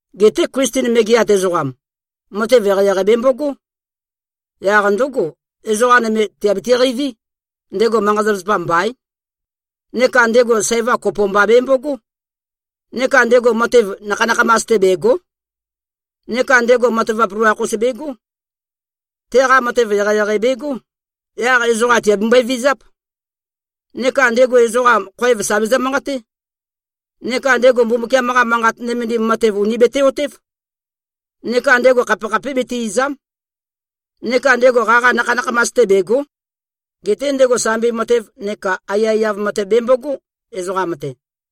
Geté Klisten megeat ezoqam, matev eqeieqei bembogó. Yaq ndǿgo, ezoqa nøme tìabiti-qeiví, ndego manqa-zapazapa mbaín. Neka ndego sæva kopo mba bembogó. Neka ndego matev nakha-nakhamas-te, bègo᷄. Neka ndego matavap loloakh-us begó. Teqa matev eqeieqei begó, yaq ezoqa tìabembøe-vizáp. Neka ndego ezoqa, khoev sà bezø-manqaté. Neka ndego Mbumbukiam-qa Manqat nømendim matev, ùni bete-otév. Neka ndego khapekhapé bete-ìza᷄m. Neka ndego qaqa nakha-nakhamas-te bègo᷄. Geté ndego sambi matev neka aiyaiyav matev bembogó, ezoqam-te.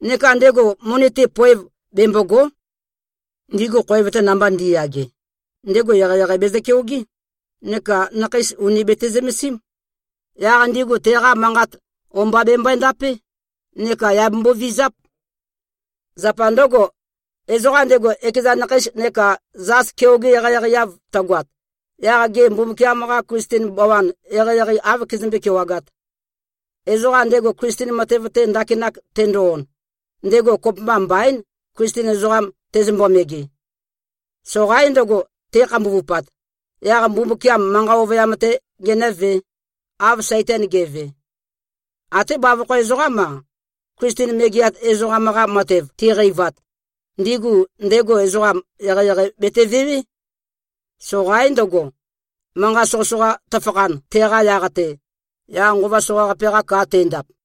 Neka ndego moni-te, poev bembògo᷄. Ndigu khoev-te namba ndi꞉yage, ndego eqeieqei bezø-keogé, neka nakheis ùni bete-zømesím. Yaq ndigu teqa manqat o-mba bembøe-ndapé neka yà bembovizáp. Zapa ndǿgo, ezoqam ndego, ekeza nakheis neka zas keoge-eqeieqei-eav tøgoat, yaq gê, Mbumbukiam-qa Klisten bawan ezoqam, eqeieqei áv kezømbé-kewagāt? Ezoqam ndego Klisten matev-te ndakinak tendo-on, ndego kopømba mbaín, Klisten ezoqam tezømbo-mege. Soqaín ndøgo, te꞉khambuvupat, yaq Mbumbukiam manqa ovøyam-tē genø̄vē, av Saitan ge꞉ve. Até bavokho ezoqám-a, Klisten megeat ezoqam-qa matev tiqeivat, ndigu ndego, ezoqa eqeieqei betevewé. Soqaín ndøgo, manqa soqøsoqa tøfakhan teqa yaq-te, yaq nqova soqaqape-qa ka tendap.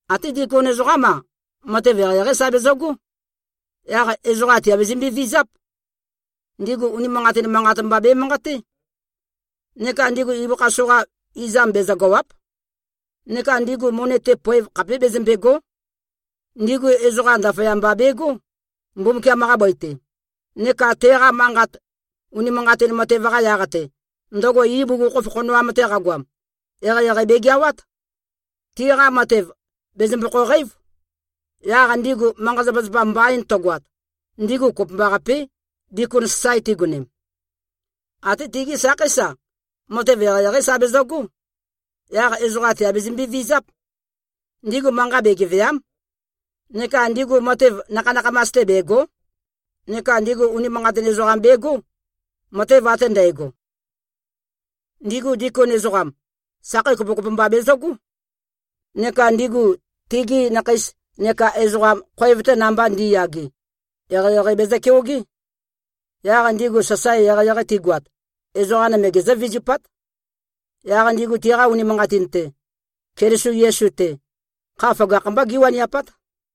Até dikon ezoqám-a, matev eqeieqeí sa bezøgó. Yaq ezoqa tìabezømbe-vizáp. Ndigu unimanqatin manqat mba bemanqaté. Neka ndigu ibøkha soqa izam bezøgàwa᷄p. Neka ndigu moni-te, poev khapé bezømbègo᷄. Ndigu ezoqa ndaføyamba begó, Mbumbukiam-qa bøi-te, neka teqa manqat, unimanqatin matev-qa yaq-te, ndøgo ibugukhokhof khonoam-te qagoam, eqeieqei begeawát. Tiqa matev, bèzømbokho-qeív. Yaq ndigu manqa-zapazapa mbain tøgoat, ndigu kopømbaqapé, dikon sasae tigonem. Até tigí sakheís-a, matev eqeieqeí sa bezøgó. Yaq ezoqa tìabezømbe-vizáp. Ndigu manqa begevèa᷄m. Neka ndigu matev nakha-nakhamas-te bègo᷄. Neka ndigu unimanqatin ezoqam begó, matev ate ndægo. Ndigu dikon ezoqam, sakhei kopokopo mba bezøgó. Neka ndigu tigi nakheis neka ezoqam, khoev-te namba ndi꞉yage, eqeieqei bezø-keogé. Yaq ndigu sasae eqeieqei tigoat, ezoqa nøme gezǿ-vizupát. Yaq ndigu tiqa unimanqatin-te, Keliso Yesu-te, kha føgakh-mbá gíwaniapát.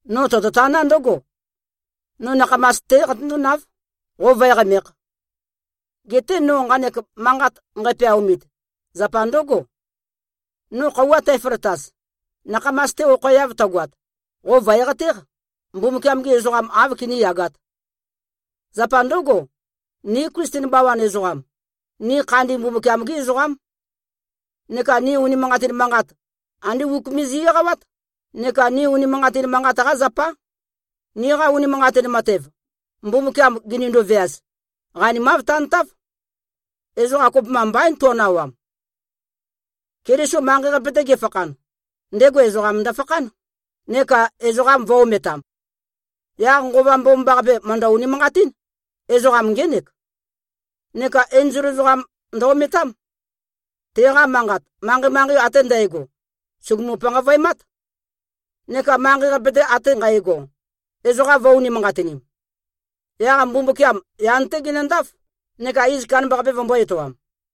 No tototaná ndǿgo: No nakhamas-té qatøndónáv, qo vǿe-qamēkh. Geté no nqanek manqat nqæpeaomit, zapa ndǿgo: No khøuwa tæføløtaz, nakhamas-te okhoeav tøgoat, qo vø̀e-qatéq, Mbumbukiam-gi ezoqam, āv kiníyagāt. Zapa ndǿgo, ni Klisten bawan ezoqam, ni khandin Mbumbukiam-gí ezoqám. Neka ni unimanqatin manqat, andé uk me zi꞉-eqawát, neka ni unimanqatin manqat-qá zapá. Niqa unimanqatin matev, Mbumbukiam ginindu-veaz, qanimav tantáv. Ezoqa kopømba mbaín to꞉nawam. Keliso manqei-qape-te gefakhan, ndego ezoqam ndøfakhán, neka ezoqa vø̄-ometam. Yaq Nqova Mbomambaqape, mø̀ndøni-unimanqatín: Ezoqam ngének. Neka enzol ezoqam ndø-ometám. Teqa manqat, manqei-manqei ate ndægo, sùgumu-panqavøemát. Neka manqei-qape-te ate nqægo, ezoqa vø̄-unimanqatinim. Yaq Mbumbukiam yan-té genøndáf, neka iz kandambaqape vømbō-etoam.